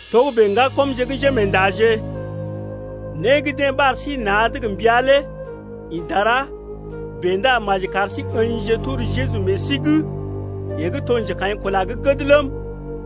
Togə́bè ŋgakɔmje gə́ njémeendaje, né gə́ deḛ ɓar sí na̰’d gə mbəa lé ḭ dara bèe ndá maji kar sí ə̰jije tor Jeju meḛ sí’g, yeḛ gə́ to njekaḭkula gə́ gəd ləm,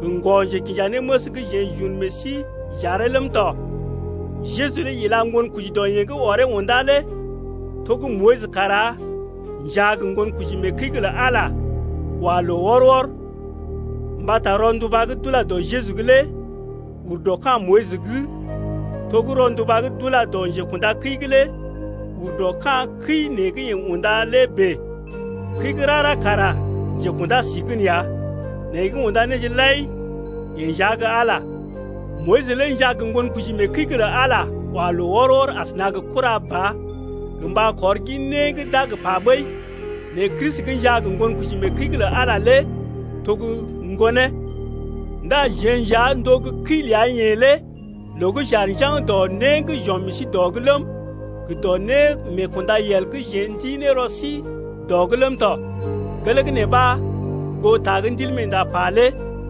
gə ŋgɔ-njekinjanéməs gə́ jeḛ j’un meḛ sí j’aree ləm tɔ. Jeju lé ila ŋgonkoji dɔ yeḛ gə́ ɔree undá lé to gə́ Moyis kara njaa gə ŋgonkoji mee kəi’g lə Ala, wa loo wɔr-wɔr. Mbata rɔnduba gə́ d’ula dɔ Jeju’g lé ur dɔ ka̰ Moyis’g, to gə́ rɔnduba gə́ d’ula dɔ njekunda kəi’g lé ur dɔ ka̰ kəi nee gə́ yeḛ unda lé bèe. Kəi gə́ rara kara njekunda sí gən ya, nɛ yeḛ gə́ unda néje lai yeḛ nja gə́ Ala ya. Moyis lé njaa gə ŋgonkoji mee kəi’g lə Ala wa loo wɔr-wɔr asəna gə kura ba gə mba kɔr gin né gə́ d’a gə pa ɓəi. Nɛ Kristi gə́ njaa gə ŋgonkoji mee kəi’g lə Ala lé to gə́ Ŋgonee. Ndá jeḛ nja n’to gə́ kəi ləa-yeḛ lé loo gə́ j’aar njaŋg dɔ né gə́ j’ɔm meḛ sí dɔ’g ləm, gə dɔ némeekundayel gə́ jeḛ n’ti ne rɔ sí dɔ’g ləm tɔ. Gelee gə́ nee ɓa, goo ta gə́ Ndilmeenda pa lé: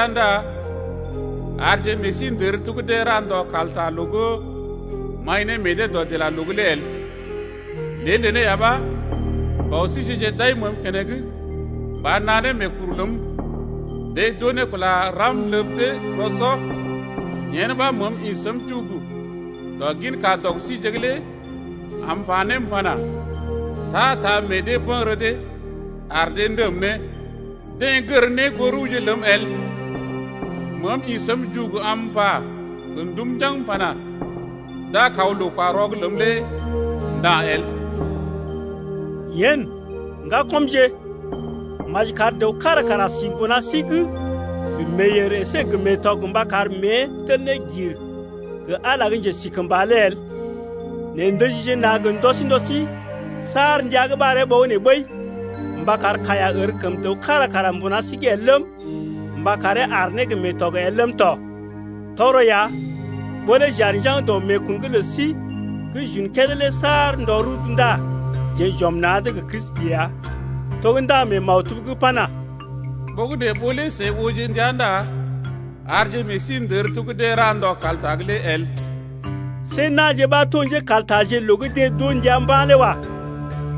Ndá arje meḛ sí ndər to gə́ deḛ ra ndɔ kalta’g loo gə́ m’aḭ ne meḛ dee dɔdilaloo’g lé el, Lée neelé ya ɓa bɔ síje-je d’aḭ məəm keneŋ mba naa ne meekuru ləm, Deḛ d’oo ne kula ram ləb dee rɔ-sɔ. Yen ɓa məəm ḭ səm jugugu dɔ gin kadɔg síje’g lé am m’pa ne m’pana: Ta-ta meḛ dee bə̰gərə dee ar dee ndəm ne, Deḛ gər ne goo rəwje ləm el. Meem ḭ səm jugugu am m’pa gə ndum njaŋg m’pana: D’a kaw loo-kwa-rɔ’g ləm lé nda̰ el. Yen, ŋgakɔmje, maji kar dəw kára kara si mbuna sí’g gə meeyèr əsé gə meetɔg mba kar mée tel ne gir gə Ala gə́ njesikəmba lé el. Nɛ ndəjije na̰ gə ndɔ sí ndɔ sí saar ndəa gə́ ɓaree ɓogənè ɓəi, mba kar kaiya ər kəm dəw kára kara mbuna sí’g el ləm, mba karee aar ne gə meetɔg el ləm tɔ. Tɔgərɔ ya ɓó lé j’aar njaŋg dɔ meekun’g lə sí gə́ j’un kédé lé saar ndɔ rudu ndá jeḛ j’ɔm na̰’d gə Kristi ya. To gə́ ndaŋg mee maktub’g pana: Ɓogənè ɓó lé seḭ ooje ndia Ndá arje meḛ sí ndər to gə́ deḛ ra ndɔ kalta’g lé el. See na̰je ɓa to njékaltaje loo gə́ deḛ d’oo ndia mba̰ lé wa.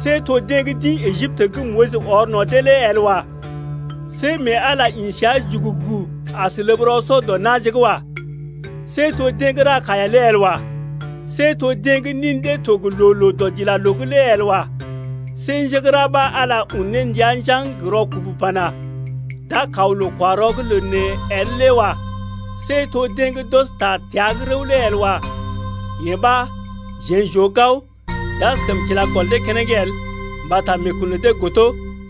See to deḛ gə́ d’ḭ Ejiptə gə́ Moyis ɔr no̰ dee lé el wa. See mee Ala ḭ səa jugugu as ləb rɔ-sɔ dɔ na̰je’g wa. See to deḛ gə́ ra kaiya lé el wa. See to deḛ gə́ nin dee to gə loo-loo dɔdilaloo’g lé el wa. See njé gə́ ra ɓa Ala un ne ndia njaŋg gə rɔkubu pana: D’a kaw loo-kwa-rɔ’g lə neḛ el lé wa. See to deḛ gə́ d’ɔs ta təa’g rəw lé el wa. Yee ɓa jeḛ j’oo gao, d’askəm kila gɔl dee keneŋ el, mbata meekun lə dee godo.